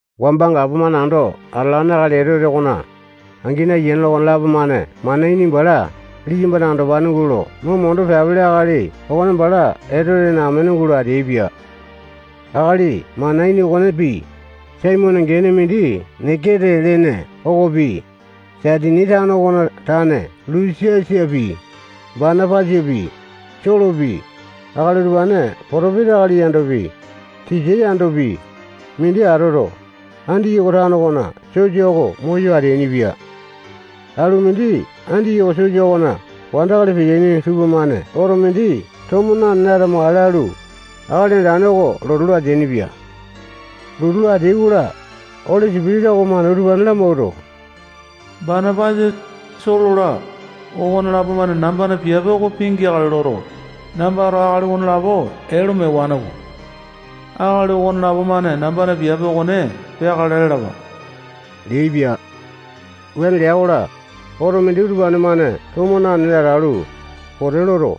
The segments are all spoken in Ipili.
Wamba gapomane ando atalane akali Etote okona angini, ayiane-la, okonelapo-mane Manaini bala liyambana andopane gulo mo mondo peapele akali okone bala Etotena amene gulo ateaipia. Akali Manaini okonepi, Simiyone gene mindi Nikete lene okopi, Saitini tano okona tane Lusiasapi, Banapasapi, Solopi, akali utupane potopesa akali yandopi, tisa yandopi, mindi atoto, Andiyoko tano okona sosa oko moyo ateainipia. Alu mindi Andiyoko sosa okona wandakali peteaini tupamane oto mindi tomo nanene atamakale lalu, Akali Andane oko lotu lo ateainipia. Lotu lo ateai-kola, Oli Sipitisa okomane utupane lamawuato, Banapasa, Solo-la, okonelapo-mane nambana piape oko pingeakale loto, nambato akali okonelapo ee lo mewane-ko. Akali okonelapo-mane nambana piape okone peakale lalapa leaipia. Wuane lea-kola, oto mindi utupane-mane tomo nanene atalu, pote loto,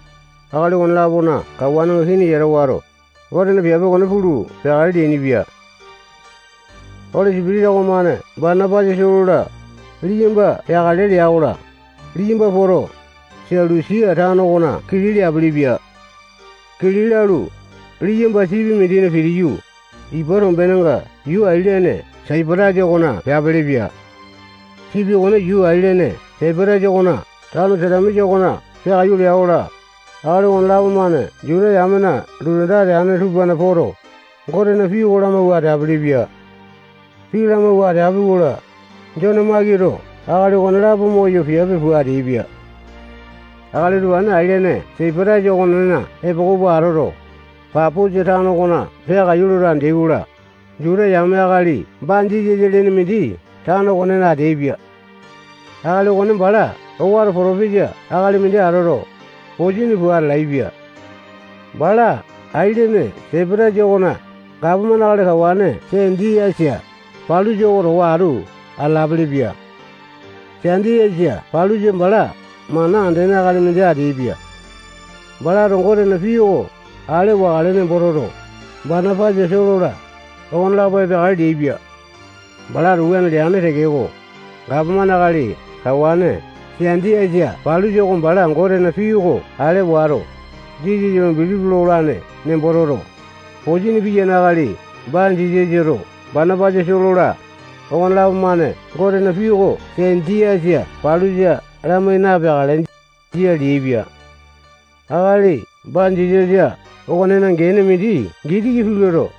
akali okone-lapona kawanenga kini yata wato, Gotena piape okone pulu peakale leainipia. Oli Sipitisa okomane Banapasa, Solo-la, liyamba peakale lea-kola, liyamba poto, Selusia tano okona kili leapilipia. Kili lalu, liyamba sipi mindina pitiyu, ipa tombenenga yuu ailene Saipatasa okona peapilipia. Sipi okone yuu ailene Saipatasa okona tano Salamisa okona peakaiyu lea-kola, akali okonelapo-mane Juta yamena lotu anda ateane tupana poto, Gotena pii oko lamawua ateapili-pia. Pii lamawua ateapi-kola, Jone Makito akali okonelapo moyo piape pua ateaipia. Akali utupane ailene Saipatasa okonena epoko pua atoto, Paposa tano okona peakaiyu loto andeai-kola, Juta yame akali Banjisasa lene mindi tano okonena ateaipia. Akali okone bala owato potopesa akali mindi atoto, posini pua atalaepia. Bala ailene Saipatasa okona gapomane akali kawane Senjiasa Palusa oko towa atu atalaepia. Senjiasa Palusa bala mana andene akali mindi ateaipia. Balato Gotena pii oko ale wakale nembo toto, Banapasa, Solo-la, okonelapo epeakale leaipia. Balato wuane leane tekeko, gapomane akali kawane Senjiasa Palusa oko bala Gotena pii oko ale wato, Jisasa lo bilipi lolane nembo toto, posini piyane akali Banjisasato Banapasa, Solo-la, okonelapo-mane Gotena pii oko Senjiasa Palusa lamai napeakale, jia leaipia. Akali Banjisasa okonena gene mindi Gitiki pii loto,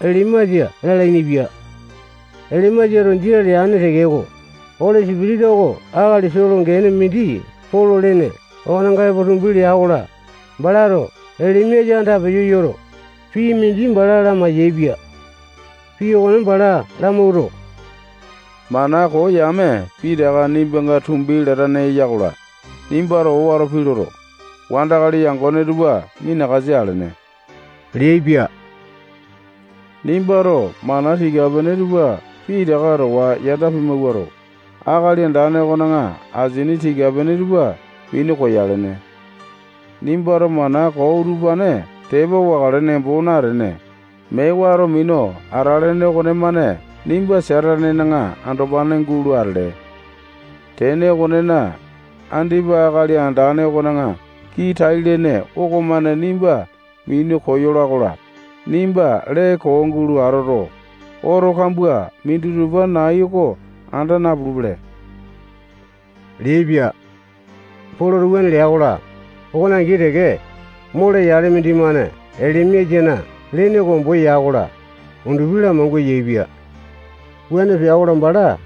Elimasa lalainipia. Elimasato jia leane tekeko, Oli Sipitisa oko akali Solo gene mindi Polo lene okonenga epo tumbi lea-kola, balato Elimasa andapeyo yoto, pii mindi bala lamai-yaepia. Pii okone bala lamawuato, mana koo yame pitaka nimbanga tumbi latane eya-kola, nimbato owato pii loto, wandakali yangone tupa minakasa alene leaipia. Nimbato mana tika-pene tupa pitaka towa yanda pimawuato, Akali Andane okona asini tika-pene tupa minu koyalene. Nimbato mana koo utupane tepa wakale nembo natene, mee wato minu atalene okonemane nimba Satanena andopane gulo atele. Tene okonena, andipa Akali Andane okona kii tai-lene okomane nimba minu koyola-kola, nimba lee koo gulo atoto, oto kambua minditupa nai oko anda napulupele leaipia. Poloto wuane lea-kola, okone angi teke, mole yale mindimane Elimasana lene oko ombo ya-kola, undupi lamangua yaepia. Wuane pea-kola, bala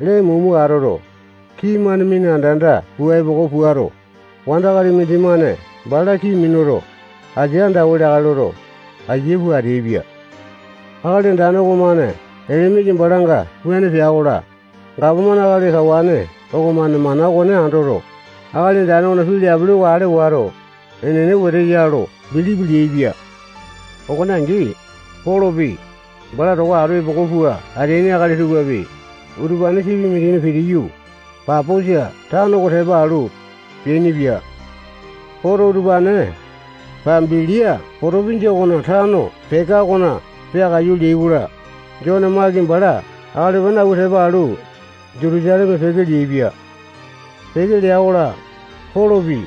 lee mumu atoto, kii-mane mina anda-anda pua epoko puato, wandakali mindimane bala kii minuto, asia andawa leakale loto, aiya pua ateaipia. Akali Andane okomane Elimasa balanga wuane pea-kola, gapomane akali kawane okomane mana okone andoto, Akali Andane okona pii leapili oko ale wato, enene wete ya lo bilipi leaipia. Okone angi, Polopi, bala towa atu epoko pua ateaini akali tupapi, utupane sipi mindina pitiyu, Paposa tano oko tepa alu, peainipia. Poto, utupane Pambilia potopinjia okona tano Peka okona peakaiyu leai-kola, Jone Maki bala akali utupane awua tepa alu, Jutusaleme peke leaipia. Peke lea-kola, Polopi,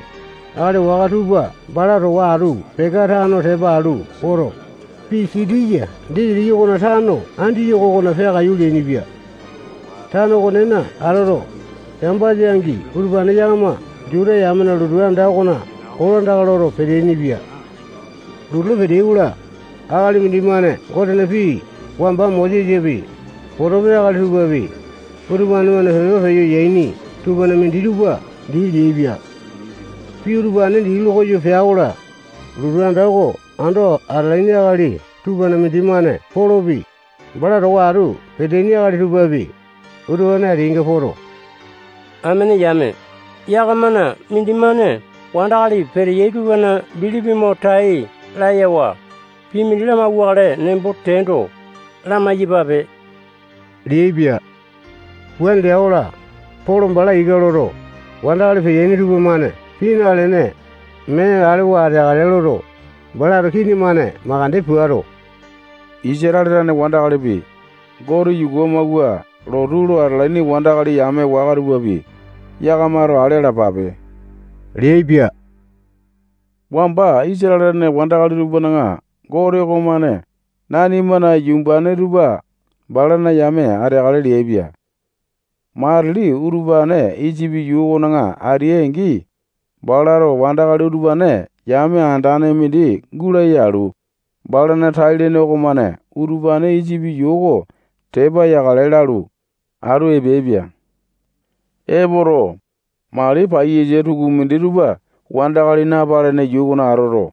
akali waka tupa bala towa atu Peka tano tepa alu poto, Pisitiya disitiki okona tano Andiyoko okona peakaiyu leainipia. Tano okonena atoto, Sambasa-angi utupane yakama Juta yamena lotu anda okona kolandaka loto peteaini-pia. Lotu lo peteai-kola, akali mindimane Gotena pii wamba Mosesapi, potopesa akali tupapi, utupane-mane pepa peyo yaini tupana minditupa dii leaipia. Pii utupane dii lokoyo pea-kola, lotu anda oko ando atalaini akali tupana mindimane Polopi, bala towa atu peteaini akali tupapi, utupane ateainga poto, amene yame, yakamana mindimane wandakali peteyai tupana bilipi mo tai layawa, pii mindi lamauwakale nembo teando, lamai-yapape leaipia. Wuane lea-kola, Polo bala ika loto, wandakali peteaini tupamane pii nalene, mee alewa ateakale loto, balato kini-mane makande puato, Isatale tane wandakalipi, Gote yuku amawua lotu lo atalaini wandakali yame waka tupapi, yakamato ale alapape leaipia. Wamba Isatale tane wandakali tupana Gote okomane nanimana yumbane tupa balana yame ateakale leaipia. Matili utupane Isipi yuu okona ateai-angi, balato wandakali utupane yame andane mindi gulaya alu, balana tai-lene okomane utupane Isipi yuu oko tepa yakale lalu, atu epeaipia. Epoto, mali paiyasa tukumindi tupa wandakali napalene yuu okona atoto,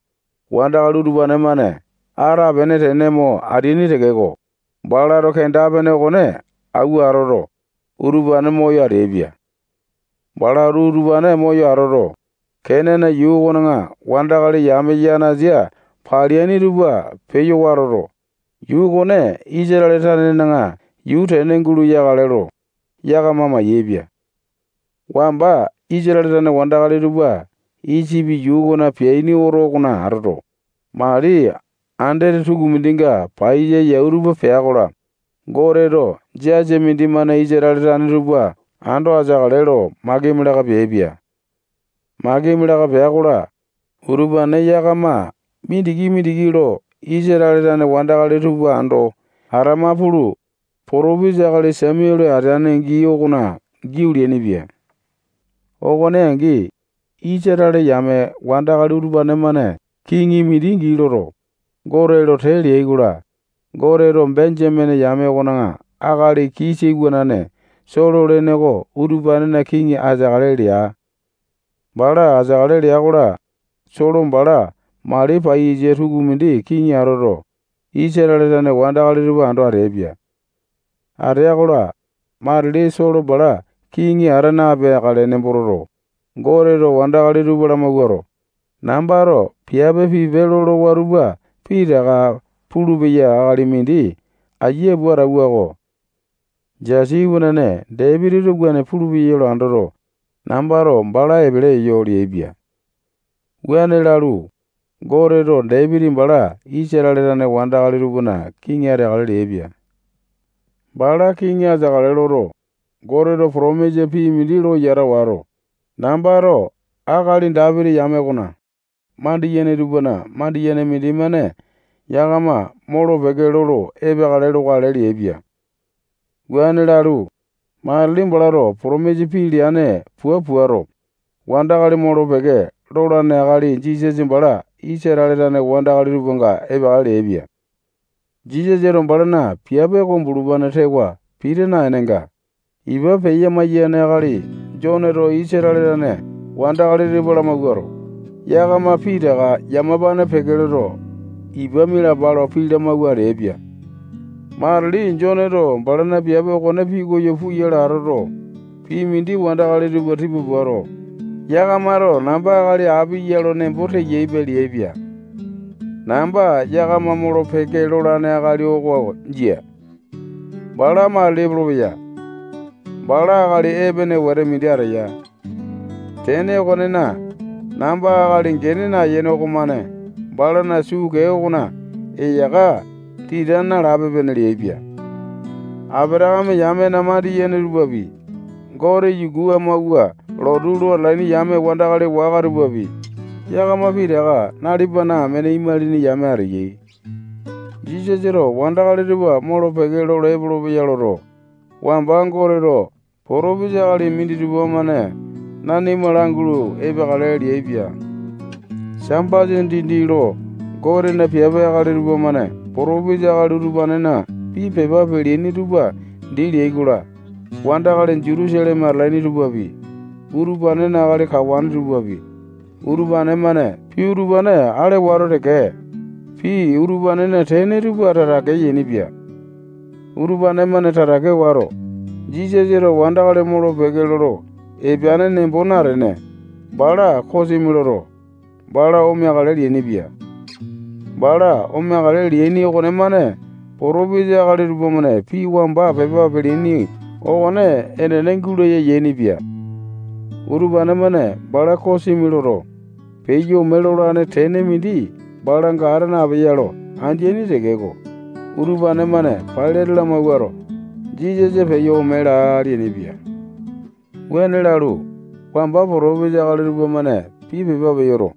wandakali utupane-mane atapene tene mo ateaini tekeko, balato kenda-pene okone awua atoto, utupane moyo ateaipia. Balato utupane moyo atoto, Kenane yuu okona wandakali yame yanasa paleaini tupa peyo watoto, yuu okone Isatale tanena yuu tene gulo yakale lo, yakama mayaepia. Wamba Isatale tane wandakali tupa Isipi yuu okona peaini oto okona atoto, mali andete tukumindinga paiyasa yau tupa pea-kola, Goteto jasa mindimane Isatale tane tupa ando ateakale lo makimi laka peaipia. Makimi laka pea-kola, utupane yakama mindiki-mindiki lo Isatale tane wandakali tupa ando atama pulu, potopesa akali Samuale ateane gii okona giau leainipia. Okone angi, Isatale yame wandakali utupane-mane kiŋi mindi gii loto, Gote lo tee leai-kola, Goteto Benjamene yame okona akali Kisa iwanane Solo lene oko utupanena kiŋi ateakale lea. Bala ateakale lea-kola, Solo bala mali paiyasa tukumindi kiŋi atoto, Isatale tane wandakali tupa ando ateaipia. Atea-kola, matili Solo bala kiŋi ata napeakale nembo toto, Goteto wandakali tupa lamawuato, nambato piape pipe lolowa tupa pitaka pulupeya akali mindi aiya pua atauwa-ko. Jesi iwanane Dapitito wuane pulupeya lo andoto, nambato bala epele eyo leaipia. Wuane lalu, Goteto Dapiti bala Isatale tane wandakali tupana kiŋi ateakale leaipia. Bala kiŋi ateakale loto, Goteto potomisa pii mindi lo yata wato, nambato akali Dapiti yame okona mandiyene tupana mandiyene mindimane yakama molo-peke lolo epeakale lokale leaipia. Wuane lalu, matili balato potomisa pii leane pua puato, wandakali molo-peke lolane akali Jisasa bala Isatale tane wandakali tupanga epeakale leaipia. Jisasato balana piape oko bulupane tewa pita naenenga, ipa peya-maiyane akali Joneto Isatale tane wandakali tupa lamawuato, yakama pitaka yamapane peke loto, ipa mialapa lo pii lamawua ateaipia. Matili Joneto balana piape okone pikoyo puyale atoto, pii mindi wandakali tupa tipa puato, yakamato namba akali api ya lo nembo teyaipe leaipia. Namba yakama molo-peke lolane akali oko jia. Bala matili epolopeya. Bala akali epene wete mindi ateya. Tene okonena, namba akali gene nayene okomane balana suu kee okona eyaka tita nalape-pene leaipia. Apatakame yamena mandiyene tupapi, Gote yuku amawua lotu lo atalaini yame wandakali waka tupapi, yakama pitaka nalipana amene imalini yame ateyai. Jisasato wandakali tupa molo-peke lolo epolopeya loto, wamba Goteto potopesa akali minditupa-mane nanima langulu epeakale leaipia. Sambasa dindi lo Gotena piape akali tupamane potopesa akali utupanena pii pepa peleaini tupa dii leai-kola, wandakali Jutusaleme atalaini tupapi, utupanena akali kawane tupapi, utupane-mane pii utupane ale wato teke, pii utupanena tene tupa tatake yainipia. Utupane-mane tatake wato, Jisasato wandakali molo-peke lolo epeane nembo natene, bala kosimi loto, bala omeakale leainipia. Bala omeakale leaini okonemane potopesa akali tupamane pii wamba pepa peleaini okone enene gulaya yainipia. Utupane-mane bala kosimi loto, peyo ome lolane tene mindi balanga ata napeya lo andeaini tekeko, utupane-mane Pailate lamawuato, Jisasa peyo ome laa leainipia. Wuane lalu, wamba potopesa akali tupamane pii pepa peyoto,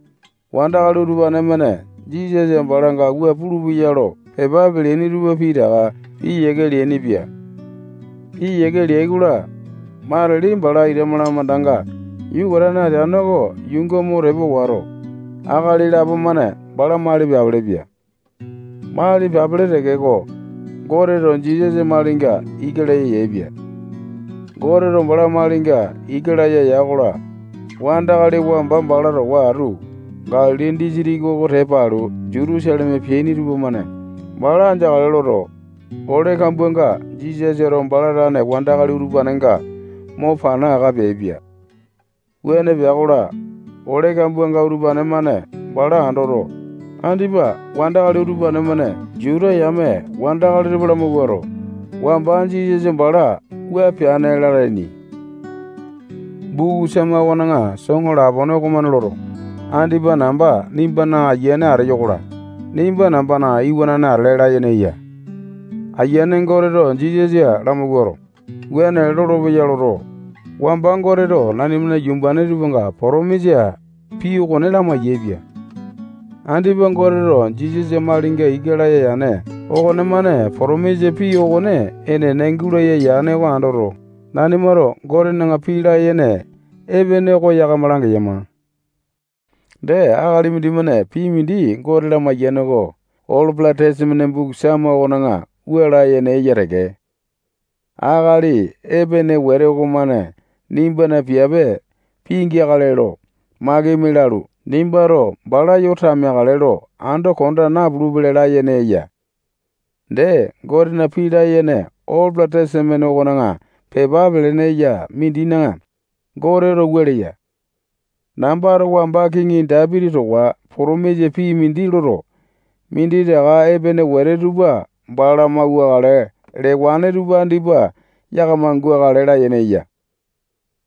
wandakali utupane-mane Jisasa balanga wua pulupeyai lo pepa peleaini tupa pitaka piyiake leainipia. Piyiake leai-kola, matili bala ita malamandanga yukatane ateane oko yuunga mo tepa wato, akali lapo-mane bala mali peapilipia. Mali peapili tekeko, Goteto Jisasa malinga ika laya yaepia. Goteto bala malinga ika laya ya-kola, wandakali wamba bala towa atu Galili disitiki oko tepa alu Jutusaleme peaini tupamane bala andeakale loto, ole kambuanga Jisasato bala tane wandakali utupanenga mo pana aka peaipia. Wuane pea-kola, ole kambuanga utupane-mane bala andoto, andipa wandakali utupane-mane Juta yame wandakali tupa lamawuato, wamba Jisasa bala wua peane lalaini. Buku Sama okona soŋo lapone okomane loto, andipa namba nimbana Ayiane ateyo-kola, nimba nambana iwanane atele layene eya. Ayiane Goteto Jisasa lamawuato, wuane lolopeya loto, wamba Goteto nanimana yumbane tupanga potomisa pii okone lamai-yaepia. Andipa Goteto Jisasa malinga ika laya yane okonemane potomisa pii okone enene gulaya yane oko andoto, nanimato Gotena pii layene epene oko yakama langeyama. Dee, akali mindimane pii mindi Gote lamaiyane oko Olo Tesamene buku Sama okona wua layene eya teke: Akali epene wete okomane nimbana piape pingeakale lo makimi lalu, nimbato bala yo tameakale lo ando konda napulupele layene eya. Dee, Gotena pii layene Olo Tesamene okona pepa pelene eya mindina Goteto wua leya: Nambato wamba kiŋi Dapiti towa potomisa pii mindi loto, minditaka epene wete tupa bala mauwakale lewane tupa andipa yakama gukale layene eya.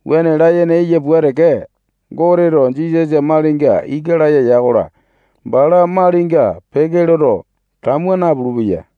Wuane layene eya pua teke, Goteto Jisasa malinga ika laya ya-kola, bala malinga peke loto, tamua napulu-peya.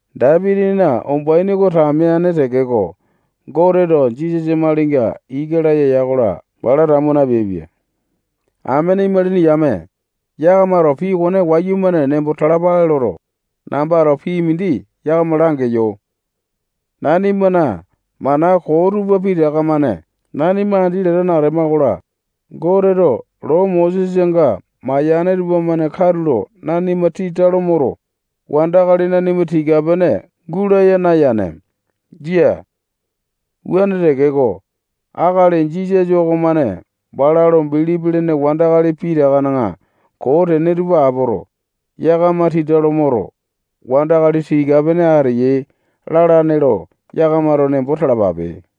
Dapitina umbaini oko tameane tekeko, Goteto Jisasa malinga ika laya ya-kola, bala tamua napeaipia. Amene imalini yame, yakamato pii okone wayumane nembo talapale loto, nambato pii mindi yakama langeyo. Nanimana mana koo tupa pitaka-mane nanima andi latane atema-kola, Goteto loo Mosesanga mayane tupamane katulo nanima tita lo moto, wandakali nanima tika-pene gulaya nayane. Jia. Wuane tekeko, akali Jisasa okomane bala lo bilipi lene wandakali pitakana koo tene tupa apoto, yakama tita lo moto, wandakali tika-pene ateyai lalane lo yakamato nembo talapape.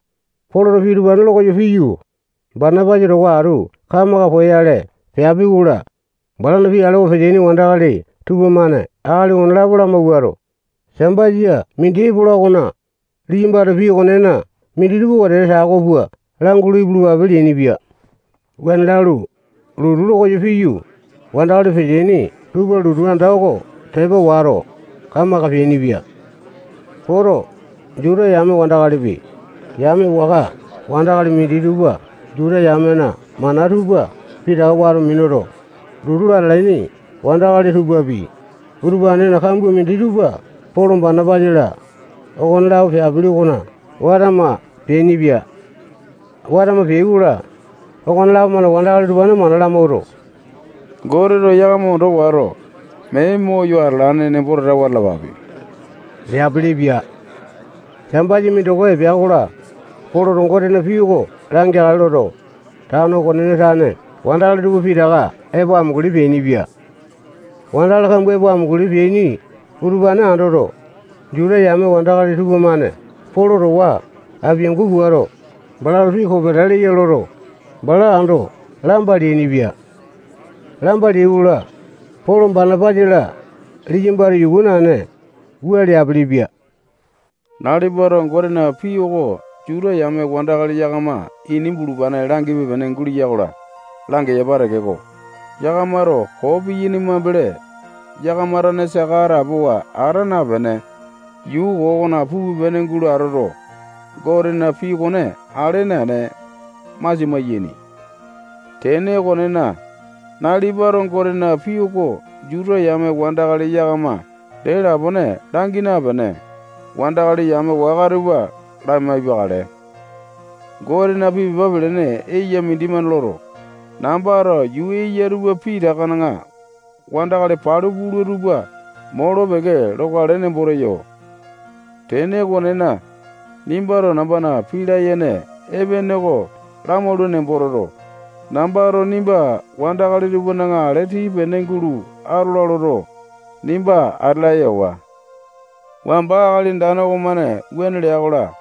Poloto pii utupane lokoyo piyu, Banapasa towa atu kamaka poyale peapi-kola, balana pii alewa peteaini wandakali tupamane akali okonelapo lamawuato, Sambasa mindi epola okona, liyambato pii okonena minditupa wetete tako pua langulu ipulupape leainipia. Wuane lalu, lotu lokoyo piyu, wandakali peteaini tupa lotu anda oko tepa wato, kamaka peainipia. Poto, Juta yame wandakalipi, yame waka wandakali minditupa Juta yamena mana tupa pitaka wato minuto, lotu lo atalaini wandakali tupapi, utupanena kambua minditupa Polo, Banapasa-la, okonelapo peapili okona watama peainipia. Watama peai-kola, okonelapo-mane wandakali utupane mana lamawuato, Goteto yakama ondo wato, mee moyo atalane nembo tatawa atalapape leapilipia. Sambasa mindoko epea-kola, Poloto Gotena pii oko langeakale loto, tano okonena tane wandakali tupa pitaka epo amunguli peainipia. Wandakali kambua epo amunguli peaini utupane andoto, Juta yame wandakali tupamane Polo towa apiangu puato, balato pii kopeta leya loto, bala ando lamba leainipia. Lamba leai-kola, Polo, Banapasa-la, liyambato yuku naene, wua leapilipia: Nalipato Gotena pii oko Juta yame wandakali yakama ini bulupane langipe-pene gulea-kola, langepa tekeko, yakamato koo piyaini mambele, yakama tane saka atapowa ata napene, yuu koo okona pupe-pene gulo atoto, Gotena pii okone ale naene, masia maiyaini. Tene okonena, nalipato Gotena pii oko Juta yame wandakali yakama dee lapone langi napene, wandakali yame waka tupa lamaipakale. Gotena pii pepa pelene eya mindimane loto, nambato yuu eya tupa pitakana wandakali palu pula tupa molo-peke lokale nembo teyo. Tene okonena, nimbato nambana pii layene epene oko lamaula nembo toto, nambato nimba wandakali tupana ale tii-pene gulo atola loto, nimba ate laya ewa. Wamba Akali Andane okomane wuane lea-kola,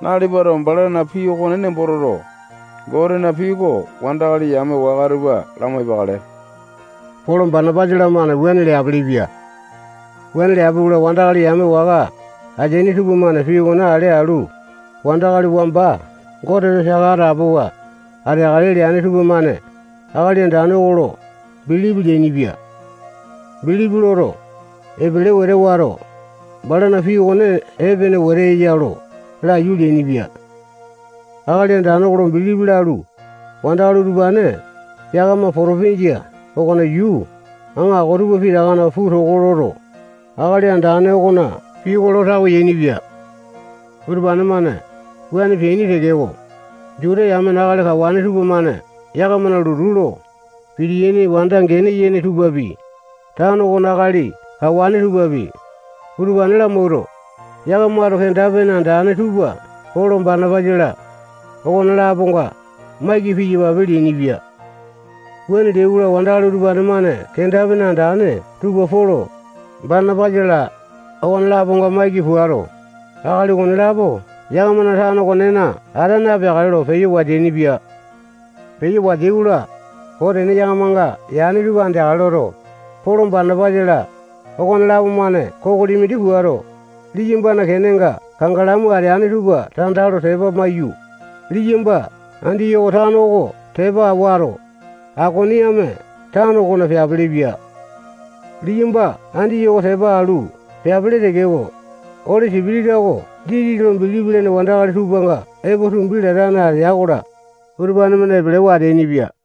nalipato balana pii okone nembo toto, Gotena pii oko wandakali yame waka tupa lamaipakale. Polo, Banapasa-lamane wuane leapilipia. Wuane leapi-kola, wandakali yame waka ateaini tupamane pii okone ale alu, wandakali wamba Goteto saka atapowa ateakale leane tupamane Akali Andane oko lo bilipi leainipia. Bilipi loto, epele wete wato, balana pii okone epene wete eya lo laiyu leainipia. Akali Andane oko lo bilipi lalu, wandakali utupane yakama potopinjia okona yuu aŋako tupa pitakana puu toko loto, Akali Andane okona pii oko lo tawe yainipia. Utupane-mane wuane peaini tekeko, Juta yamena akali kawane tupamane yakamana lotu lo pitiyaini wanda gene yene tupapi, tano okona akali kawane tupapi, utupane lamawuato, yakamato kenda-pene andane tupa Polo, Banapasa-la, okone-laponga maiki piyapa leainipia. Wuane leai-kola, wandakali utupane-mane kenda-pene andane tupa Polo, Banapasa-la, okone-laponga maiki puato, akali okonelapo yakamana tano okonena ata napeakale lo peyo wateainipia. Peyo wateai-kola, koo tene yakamanga yane tupa andeakale loto, Polo Banapasa-la, okonelapo-mane kokoli mindi puato, liyambana kenenga kangalamu ateane tupa tanda lo tepa maiyu, liyamba Andiyoko tano oko tepa wato, Aikoniame tano okona peapilipia. Liyamba Andiyoko tepa alu peapili tekeko, Oli Sipitisa oko Jisasa lo bilipi lene wandakali tupanga epo tumbi latane atea-kola, utupane-mane epelewa ateainipia.